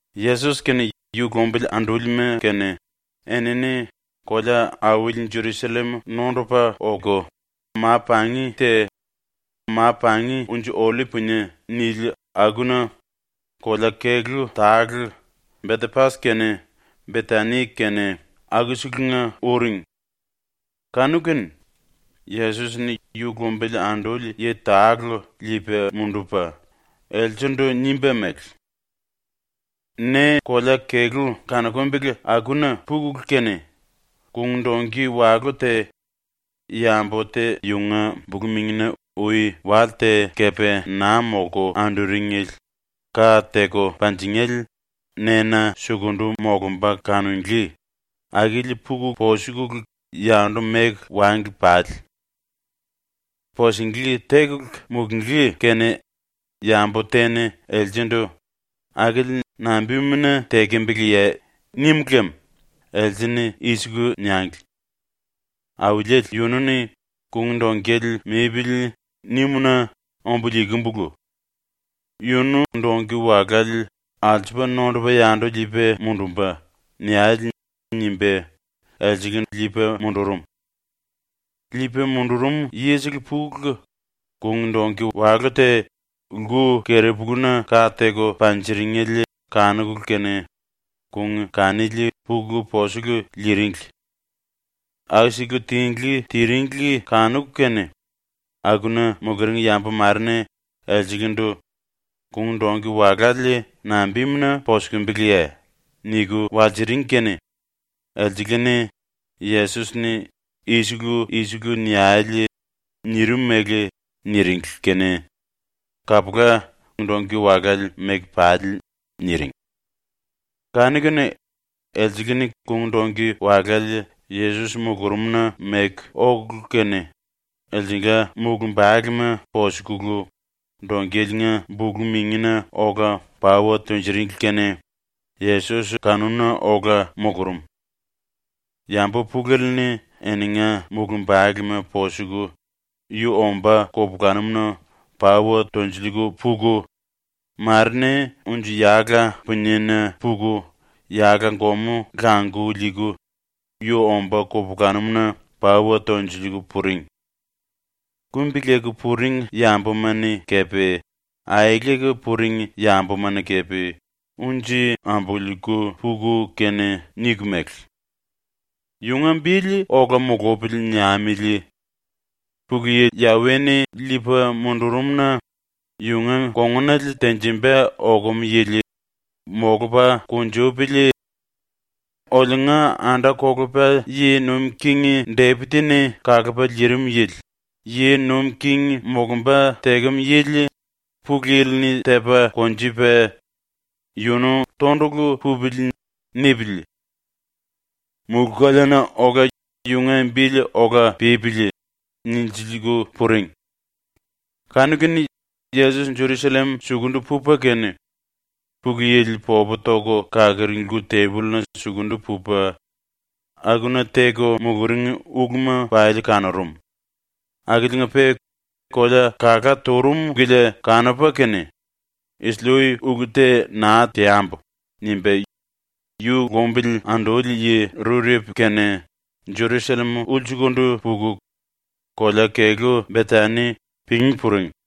⸤Yesos kene yu lumbili andúlima kene⸥ enini kolea-auli Jerusallem nondupa oku, ma-pangi te ‘Ma-Pangi Unji-Ollip Punie’ nili akuna kolea-kelú tale, Betepas kene Betani kene akuselenga uring. Kanu-kene Yesos-ni yu lumbili anduli yi tale liipa mundupa, elselendu nimba mele: “Ne kolea-kelú kanukumbele akuna pukulu kene kung-dongki walú te, yambu te yunga bulu-mingina ui wale te kepe naa molku anduringele ka teku panjingéle nena sukundu molumba kanunglí, akili puku posukulu yandu meku wangli pale. Pusinglí tekulu mulunglí kene yambu te-ni elsendu “Akili nambimuna tekembeleye?” nim lem else-ni i-siku niangli: “Auliele yunu-ni ‘Kung-dongkele mipili.’ nimu-na ombu liikimbulu. Yunu dongki-walále alsupa nondupa yandu liipa mundumba.” niale.” nimba elsele liipa mundurum. Liipa mundurum yisele pukulu, kung-dongki walú te, lku-keri-puluna ka teku panjiringele kanukulu kene kung kanili puku posiku liiringli. Aku-siku tinglí tiringli kanuku kene akuna muluring yambu mare-ni elselendu “Kung-dongki walále nambimuna posukimbiliye?” niku walsiring kene elsele-ni, Yesos-ni ‘i-siku i-siku niale.’ nirim mele niringli kene “Kapula, ⸤dongki-walále⸥ meku pale.” niring. Kanu-kene elsele-ni kung-dongki walále Yesos mulurumna meku okulu kene, elsengla mulumbalema posukulu, dongkeliinga bulu-mingina ola pauwa tunjuringli kene Yesos kanuna ola mulurum. Yambu pulele-ni eninga mulumbalema posuku yu ombá kupulanum-na pauwa tolsiliiku puku, mare-ni unji-yala puniena puku yala-gomú languku liiku yu ombá kupulanum-na pauwa tolsiliiku puring. Kumbi-leku puring yambuma-ni kepe aeleku puring yambuma-ni kepe unji ambululiiku puku kene niku mele: “‘Yunga bili ola mulupili.’ niamili. ‘Pulu Yi Yawe-ni liipa mundurum-na yunga kongunale tenjimba okum yili molupa kunjupili!’ Oliunga anda-kolepa yi nuim king Depit⸤-ni kalupa liirim yili⸥ yi nuim king molumba tekem yili Pulu Yili-ni tepa konjupa ‘Yunu tondulu pupili.’ nipili. Mulú-koleana ola yunga bili ola pípili!” nilsiliiku puring. Kanu-kene Yesos Jerusallem sukundu pupa kene Pulu Yili popu toku kaluring lku-tembolluna sukundu pupa akuna ⸤teku muluring uluma⸥ pali kanurum, akiliinga-pe kolea kalá turum kilia kanupa kene ⸤‘Isili-ui ulu te naa teambu.’ nimba⸥ yu lumbili anduli yi rurepu kene ⸤Jerusallem⸥ ulsukundu puku, kolea-kelú Betani ⸤pingí⸥ puring.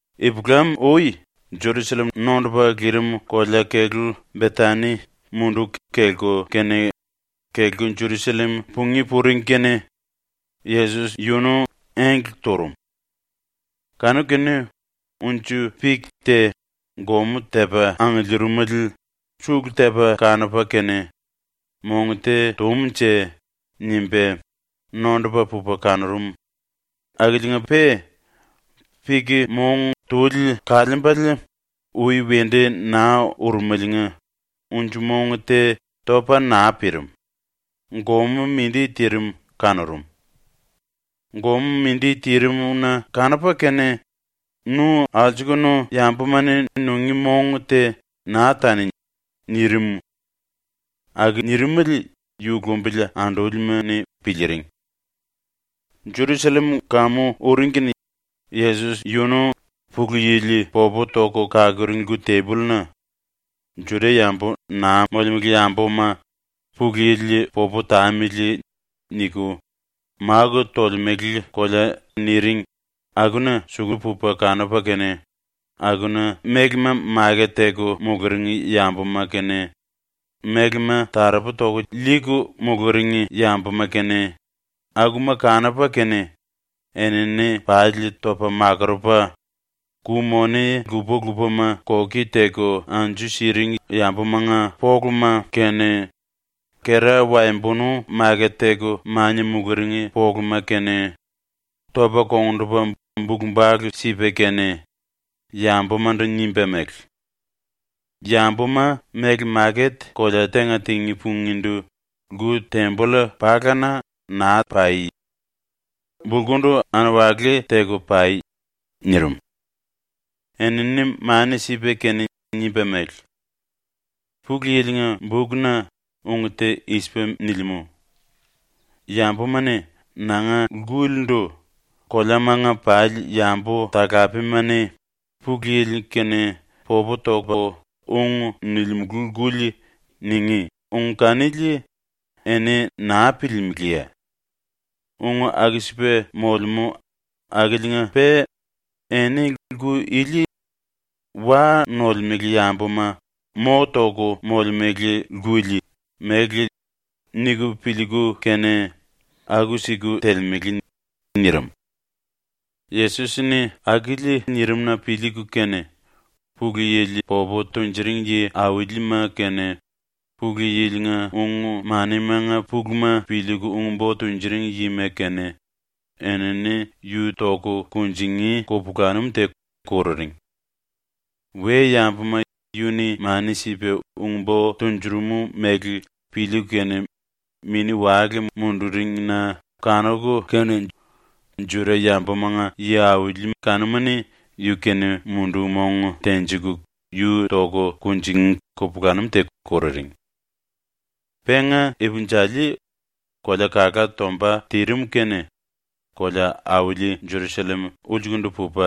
Ipulam-ui ⸤Jerusallem nondupa lirim⸥ kolea-kelú Betani munduku kelku kene ⸤kelku Jerusallem pungí puring kene⸥ Yesos yunu engle turum. Kanu-kene unji-pik te gomú tepa angiliirimele sulu tepa kanupa kene ‘Mong te túmunje.’ nimba nondupa pupa kanurum akiliinga-pe, pik-mong tuli kaliimbele ui wendu naa urumeliinga unji-mong te topa naa pirim, gomú mindi tirim kanurum. ⸤Gomú mindi tirim-na⸥ kanupa kene “Nu alsukunu yambuma-ni nungí mong te naa tani!” nirim. Aku nirimele yu lumbili andúlima-ni piliiring. Jerusallem kamu uring kene Yesos yunu Pulu Yili popu toku kaluring lku-tembolluna ⸤“Juda-yambu naa molemele yambuma ‘Pulu Yili popu tamili.’ niku máku tolemele kolea” niring akuna⸥ suku pupa kanupa kene akuna mélema maket teku muluring yambuma kene, mélema taropu toku liiku muluring yambuma kene, akuma kanupa kene enini pali topa makurupa, ku-moni lupa-lupama koki teku anju siring yambumanga poluma kene, kera-waembonu maket teku mania muluring poluma kene, topa kongndupa bulu-bale sipa kene, yambumandu nimba mele: “Yambuma méle maket kolea tenga tingí pungíndu lku-temboll palana naa pai. ⸤Bulkundu anwali teku pai.⸥” nirim. Enini mani sipa kene nimba mele: “Pulu Yili-nga bukna ung te i-sipa nilimú: ‘Yambuma-ni nanga lkulindu “Koleamanga pali yambu-talapema-ni Pulu Yili-kene popu topu ung nilimulu lkuli.” ningí.’ ung kanili eni naa piliilimiliye? Ung aku-sipa molemú akiliinga-pe eni lku ili ‘wa nolemele yambuma mo toku molemele lkuli’ mele niku piliiku kene aku-siku telemele.” nirim. Yesos-ni akili nirim-na piliiku kene Pulu Yili popu tunjuring yi-aulima kene, Pulu Yili-nga ung-manimanga puluma piliiku ung-bo tunjuring yima kene, enini yu toku kunjingí kupulanum te kururing. We-yambuma yu-ni mani sipa ung-bo tunjurum mele piliiku kene mini-wale munduring-na kanuku kene Juda-yambumanga yi-auli kanuma-ni yu-kene mundu-mong tenjiku yu toku kunjingí kupulanum te kururing. Penga ipinjali, kolea kalá tomba tirim kene kolea-auli ⸤Jerusallem⸥ ulsukundu pupa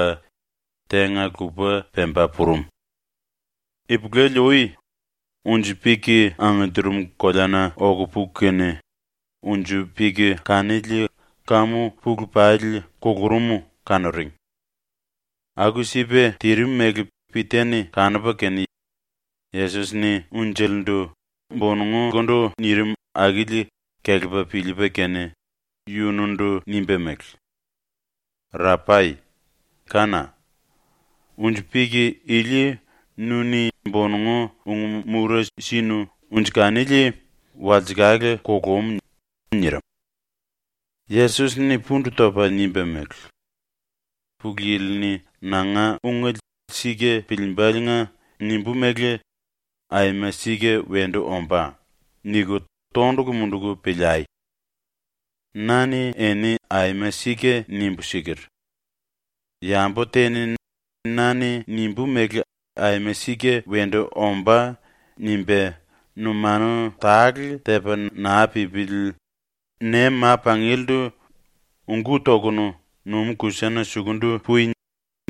⸤tenga-lupa pemba purum⸥. Ipulele-ui, ⸤unji-pik angiliirim koleana⸥ oku puku kene unji-pik kanili kamu pulu pali kulurum kanuring. Aku-sipa tirim mele Pita-ni kanupa kene ⸤Yesos-ni unjelendu bonongukundu nirim akili⸥ kelepa piliipa kene yunundu nimba mele: “Rapai, kána! Unji-pik ili nu-ni ⸤bonongu⸥ ung-mura sinu unji kanili ⸤walsekale⸥ kulum.” nirim. Yesos-ni pundu topa nimba mele: “Pulu Yili-ni nanga ungele sika piliimba⸤liinga nimbú mele ‘Aima sika wendu ombá.’ niku⸥ tondulu munduku piliai. Na-ni eni aima sika nimbu siker: “Yambu te-ni ‘na-ni nimbú mele aima sika wendu ombá.’ nimba numanu tale tepa naa pípili ne ma-pangielendu “Ungú tokunu numú-kusana sukundu pui!”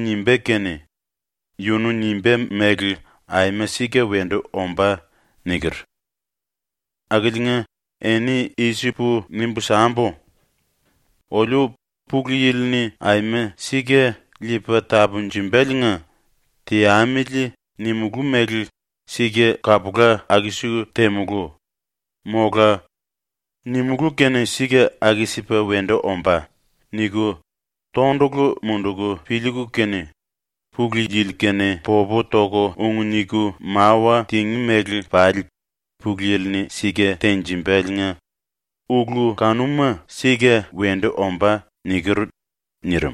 nimbá kene yunu nimbá mele aima sika wendu ombá.” niker. Akiliinga eni i-sipu nimbu sambu: “‘Oliu ⸤Pulu Yili-ni aima sika liipa tapunjumbaliinga ‘Teamili.’ nimulú mele sika kapula aku-sipu temulú.’ mola ‘Nimulú kene sika aku-sipa wendu ombá.’ niku⸥ tondulu munduku piliiku kene Pulu Yili-kene popu toku ung niku mawa tingí mele pali Pulu Yili-ni sika tenjimbaliinga ulu kanuma sika wendu ombá.” niker.” nirim.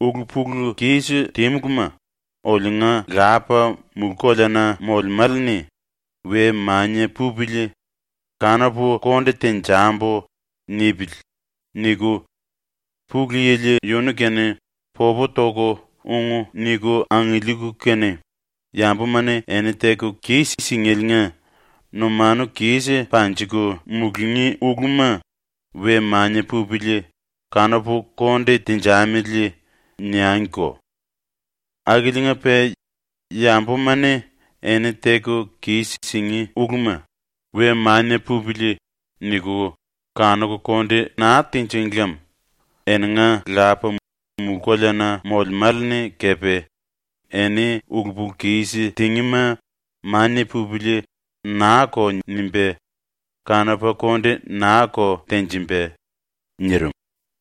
“‘Ulu-pulu-kis tímuluma oliunga Lapa mulú-koleana molemále-ni ‘We mania pupili, kanupu konde tenjambu.’ nipili.’ niku, ⸤Pulu Yili⸥ yunu-kene popu toku ung niku angiliiku kene yambuma-ni eni teku kis-singéliinga numanu kis panjiku mulungí uluma ‘We mania pupili. Kanupu konde tenjamili.’ niangiko. (Akiliinga-pe yambuma-ni eni teku kis-singí uluma ‘We mania pupili.’ niku kanuku konde naa tinjíng lem eninga Lapa mulú-koleana molemále-ni kepe eni ulu-pulu-kis tingíma ‘Mania pupili.’ naa-ko nimba kanupa konde naa-ko tenjimba.)” nirim.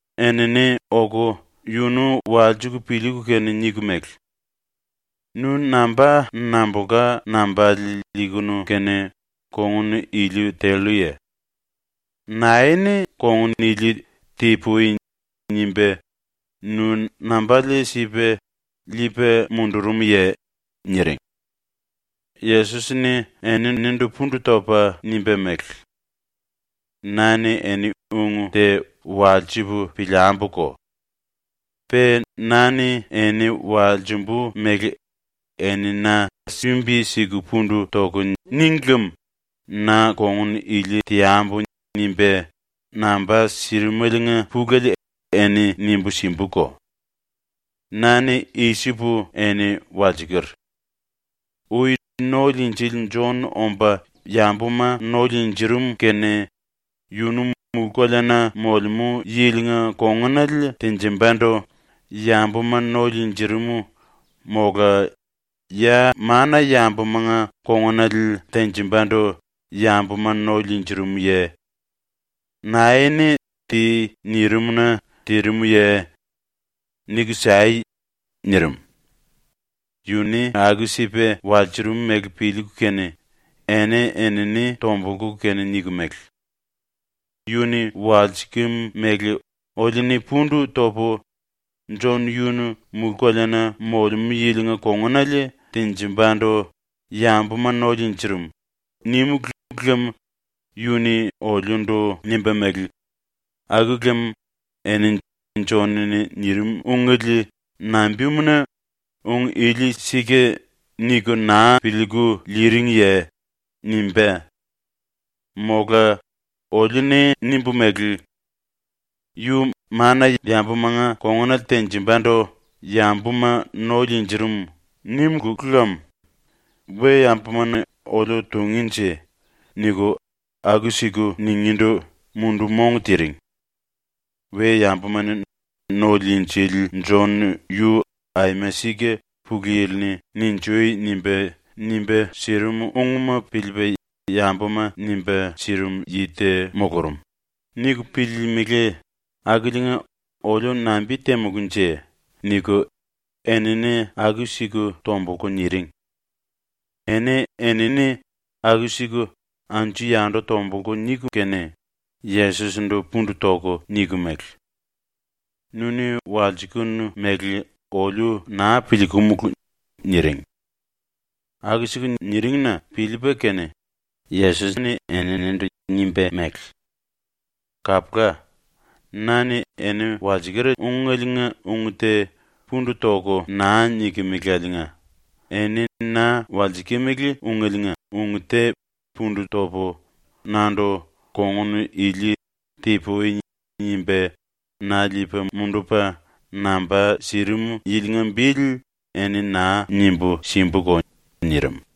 enini oku yunu walsiku piliiku kene niku mele: “Nu namba nambulka nambale liikunu kene kongun ili telluye? Nae-ni kongun ili ‘Ti-pui.’ nimba nu nambale sipa liipa mundurumye?” niring. Yesos-ni eninindu pundu topa nimba mele: “Na-ni eni ung te walsipu piliambuko. Pe na-ni eni walsimbu mele eni na sumbi-siku pundu toku níngi lem ‘Na kongun ili teambu.’ nimba namba sirimeliinga pulele eni nimbu simbuko. ⸤Na-ni i-sipu eni walsiker:⸥ Ui ⸤No-Liinjili⸥ Jon omba yambuma no liinjirim kene yunu mulú-koleana ⸤molemú yilinga⸥ kongunale tenjimbandu yambuma no liinjirim mola ya mana-yambumanga kongunale tenjimbandu yambuma no liinjirimuye? ⸤Nae-ni “Ti.” nirim-na tirimuye?⸥ Niku sai.” nirim. ⸤Yu-ni aku-sipa walsurum mele piliiku kene⸥ eni-enini tombulku kene niku mele: “Yu-ni walsikim mele oliu-ni pundu topu, ‘⸤Jon⸥ yunu mulú-koleana ⸤molemú yilinga kongunale tenjimbandu yambuma no liinjirim⸥.’ nímulu lem yu-ni oliundu nimba mele: ‘Aku lem eni Jon-ni nirim ungele nambimuna ‘Ung ili sika.’ niku naa piliiku liiringiye?’ nimbá. Mola oliu-ni nimbu mele: ‘Yu mana-yambumanga ⸤kongunale tenjimbandu yambuma no liinjirim⸥.’ nímulu lem “We-yambuma-ni oliu tungínje.” niku aku-siku ningíndu mundu-mong tiring. We-yambuma-ni ‘⸤No-Liinjili⸥ Jon yu aima sika Pulu Yili-ni “Ninjui!” nimba, nimba sirimu ungma piliipa yambuma nimba sirim yi te mulurum.’ niku piliilimili akiliinga oliu nambi-temulúnje?” niku enini aku-siku tombulku niring. ⸤Eni-enini aku-siku anju-yandu tombulku niku kene⸥, Yesos-ndu pundu toku niku mele: “⸤Nu-ni walsikenu mele⸥ oliu naa piliikumulu.” niring. Aku-siku niring-na piliipa kene Yesos-ni eninindu nimba mele: “Kapula. ⸤Na-ni eni walsiker ungeliinga ung te pundu toku naa nikimilieliinga⸥ eni na walsikimili ungeliinga ung te pundu topu, nandu kongun ili ‘Ti-pui.’ nimba na liipa mundupa namba sirim yilinga bili eni naa nimbu simbuko.” nirim.